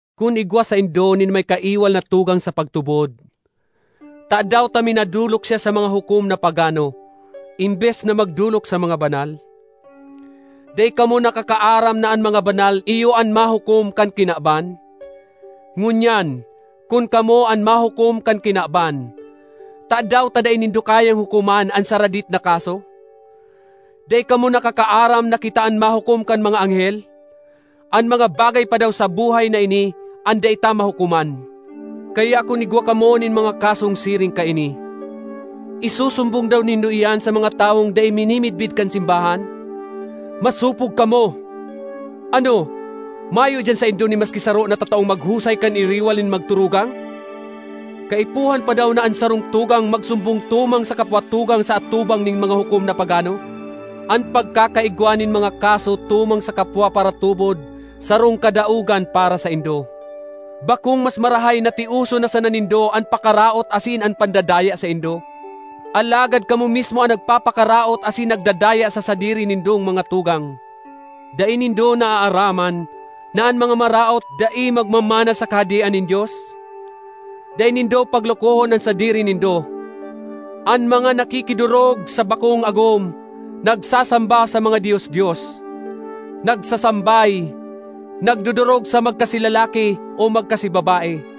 Kun igwa saindo nin may kaiwal na tugang sa pagtubod, tadaw ta minadolok siya sa mga hukom na pagano, embes na magdolok sa mga banal? Dai kamo nakakaaram na an mga banal iyo an mahukom kan kinaban? Ngunyan, kun kamo an mahukom kan kinaban, tadaw ta dai nindo kayang hukoman an saradit na kaso? Dai kamo nakakaaram na kita an mahukom kan mga anghel? An mga bagay pa daw sa buhay na ini an dai ta mahukoman! Kaya kun igwa kamo nin mga kasong siring kaini, isusumbong daw nindo iyan sa mga tawong dai minimidbid kan simbahan? Masopog kamo! Ano, mayo diyan saindo nin maski saro na tataong maghusay kan iriwal nin magturugang? Kaipuhan pa daw na an sarong tugang magsumbong tumang sa kapwa tugang sa atubang nin mga hukom na pagano? An pagkakaigwa nin mga kaso tumang sa kapwa paratubod sarong kadaogan para saindo. Bakong mas marahay na tioson na sana nindo an pakaraot asin an pandadaya saindo? Alagad kamo mismo an nagpapakaraot asin nagdadaya sa sadiri nindong mga tugang. Dai nindo naaaraman na an mga maraot dai magmamana sa Kahadean nin Dios? Dai nindo paglokohon an sadiri nindo. An mga nakikidorog sa bakong agom, nagsasamba sa mga dios-dios, nagsasambay, nagdodorog sa magkasi lalaki o magkasi babae,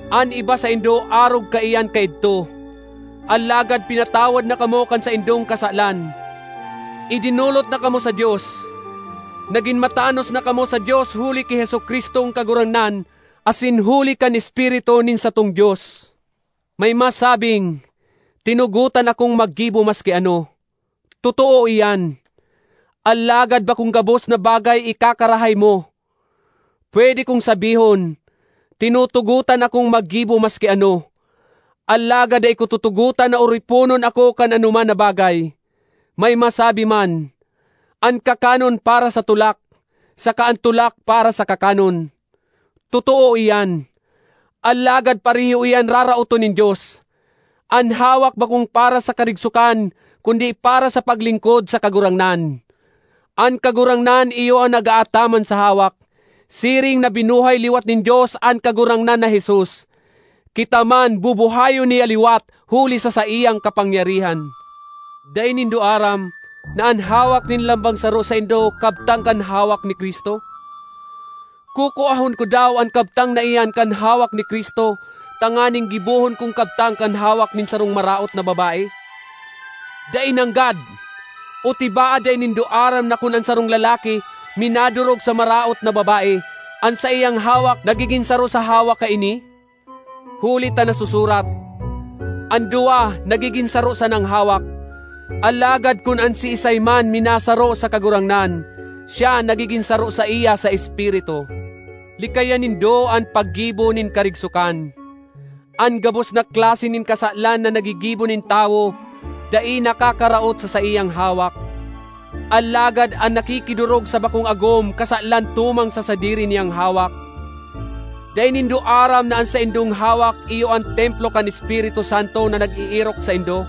An iba saindo arog kaiyan kaidto. Alagad pinatawad na kamo kan saindong kasalan; idinolot na kamo sa Dios. Nagin matanos na kamo sa Dios huli ki Jesu-Cristong Kagurangnan asin huli kan Espiritu nin satong Dios. May masabing, “Tinugotan akong maggibo maski ano.” Totoo iyan, alagad bakong gabos na bagay ikakarahay mo. Pwede kong sabihon, “Tinutugotan akong maggibo maski ano,” alagad dai ko tutugotan na oriponon ako kan anoman na bagay. May masabi man, “An kakanon para sa tulak, saka an tulak para sa kakanon.” Totoo iyan, alagad pareho iyan raraoton nin Dios. An hawak bakong para sa karigsokan kundi para sa paglingkod sa Kagurangnan; an Kagurangnan iyo an nag-aataman sa hawak. Siring na binuhay liwat nin Dios an Kagurangnan na Jesus, kita man bubuhayon niya liwat huli sa saiyang kapangyarihan. Dai nindo aram na an hawak nin lambang saro saindo kabtang kan hawak ni Cristo? Kukuahon ko daw an kabtang na iyan kan hawak ni Cristo tanganing gibohon kong kabtang kan hawak nin sarong maraot na babae? Dai nanggad! O tibaad dai nindo aram na kun an sarong lalaki minadorog sa maraot na babae, an saiyang hawak nagigin saro sa hawak kaini? Huli ta nasusurat, “An duwa nagigin saro sanang hawak.” Alagad kun an siisay man minasaro sa Kagurangnan, siya nagigin saro saiya sa espiritu. Likayan nindo an paggibo nin karigsokan. An gabos na klase nin kasalan na nagigibo nin tawo dai nakakaraot sa saiyang hawak, alagad an nakikidorog sa bakong agom kasalan tumang sa sadiri niyang hawak. Dai nindo aram na an saindong hawak iyo an templo kan Espiritu Santo na nag-eerok saindo,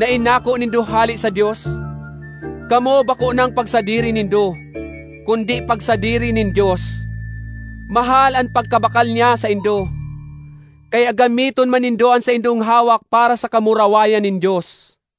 na inako nindo hale sa Dios? Kamo bako nang pagsadiri nindo, kundi pagsadiri nin Dios;—mahal an pagkabakal niya saindo. Kaya gamiton man nindo an saindong hawak para sa kamurawayan nin Dios.